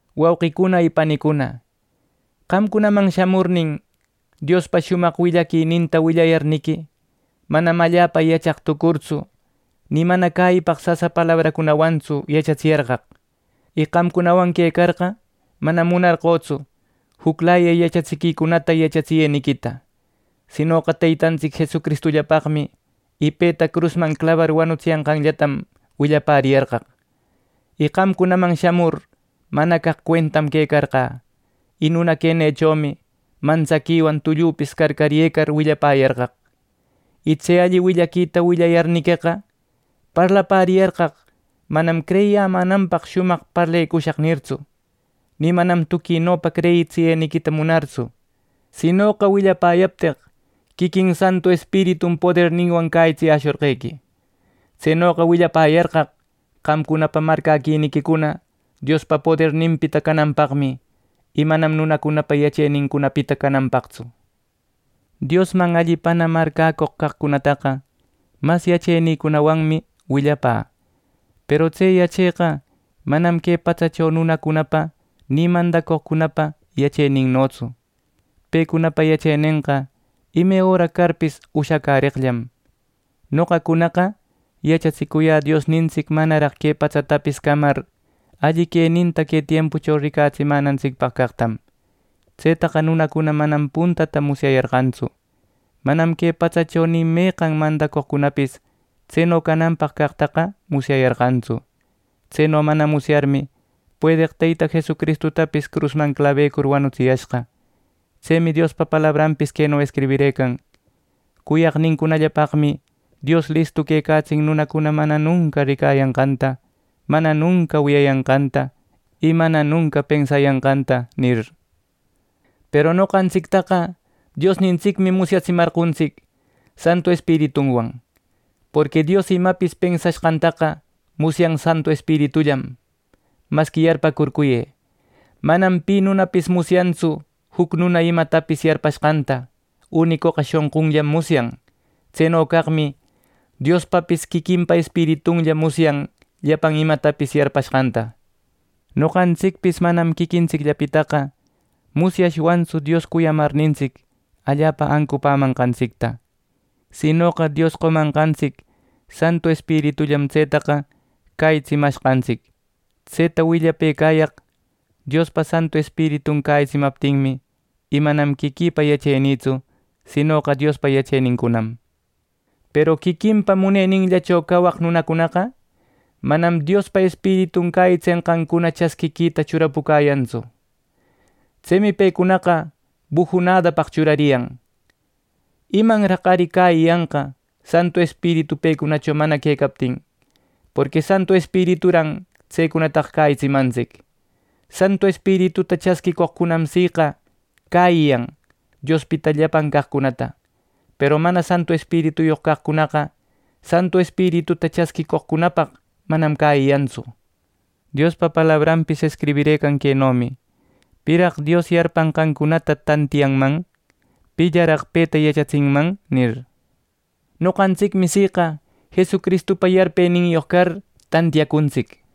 Wauqicuna y panicuna, qamcunaman shamurnin Diospa shumaq willaquininta willayarniqui, manam allapa yachaq tucurtsu, ni mana cäyipaq sasa palabracunawantsu yachatsiyarqaq. Y qamcunawan quecarqa manam munarqötsu juclaya yachatsiquicunata yachatsiyeniquita; sinoqa Teytantsic Jesucristullapaqmi y peta crusman clabar wanutsiyanqanllatam willapäriyarqaq. Y qamcunaman shamur mana caq cuentam quecarqä, y nuna quenïchomi mantsaquiwan tullüpis carcaryëcar willapäyarqaq. Y tse alli willaquita willayarniqueqa, parlapäriyarqaq manam “Creyiyämänanpaq shumaq parlecushaq” nirtsu, ni manam tuquinopa creyitsiyeniquita munartsu; sinoqa willapäyapteq quiquin Santu Espiritum poderninwan cäyitsiyäshorqequi. Tsenoqa willapäyarqaq qamcunapa marcäquiniquicuna Diospa poderninpita cananpaqmi, y manam nunacunapa yachenincunapita cananpaqtsu. Diosman allipana marcäcoq caqcunataqa mas yachenïwanmi willapä; peru tse yacheqa manam que patsacho nunacunapa ni mandacoqcunapa yacheninnotsu. Pecunapa yachenenqa ime öra carpis ushacäreqllam. Noqacunaqa yachatsicuyä Diosnintsic manaraq que patsatapis camar alli queninta que tiempucho ricatsimänantsicpaq caqtam. Tsetaqa nunacuna manam puntata musyayarqantsu. Manam que patsacho ni meqan mandacoqcunapis tseno cananpaq caqtaqa musyayarqantsu. Tseno mana musyarmi, puedeq Teyta Jesucristutapis crusman clabecur wanutsiyashqa. Tsemi Diospa palabranpis queno escribirëcan: “Cuyaqnincunallapaqmi Dios listu quecatsin nunacuna mana nunca ricayanqanta, mana nunca wiyayanqanta y mana nunca pensayanqanta” nir. Peru noqantsictaqa Diosnintsicmi musyatsimarqontsic Santu Espiritunwan. Porqui Dios imapis pensashqantaqa musyan Santu Espiritullam. Masqui yarpäcurcuyë: Manam pi nunapis musyantsu juc nuna imatapis yarpashqanta, unicoqa shonqunllam musyan. Tseno caqmi Diospapis quiquinpa Espiritunlla musyan llapan imatapis yarpashqanta. Noqantsicpis manam quiquintsicllapitaqa musyashwantsu Dios cuyamarnintsic allapa ancupämanqantsicta; sinoqa Dios qomanqantsic Santu Espiritullam tsetaqa cäyitsimashqantsic. Tseta willapëcayaq Diospa Santu Espiritun cäyitsimaptinmi, y manam quiquïpa yachenïtsu, sinoqa Diospa yachenincunam. Peru quiquinpa muneninllacho cawaq nunacunaqa manam Diospa Espiritun cäyitsenqancuna chasquita churapucäyantsu. Tsemi pecunaqa bujunädapaq churariyan. ¡Imanraq ari cäyiyanqa Santu Espiritu pecunacho mana quecaptin, porqui Santu Espirituran tsecunataqa cäyitsimantsic! Santu Espirituta chasquicoqcunam siqa cäyiyan Diospita llapan caqcunata; peru mana Santu Espirituyoq caqcunaqa Santu Espirituta chasquicoqcunapaq manam cäyiyantsu. Diospa palabranpis escribirëcan quenomi: “¿Piraq Dios yarpanqancunata tantiyanman? ¿Pillaraq peta yachatsinman?” nir. Noqantsicmi siqa Jesucristupa yarpeninyoq car tantiyacuntsic.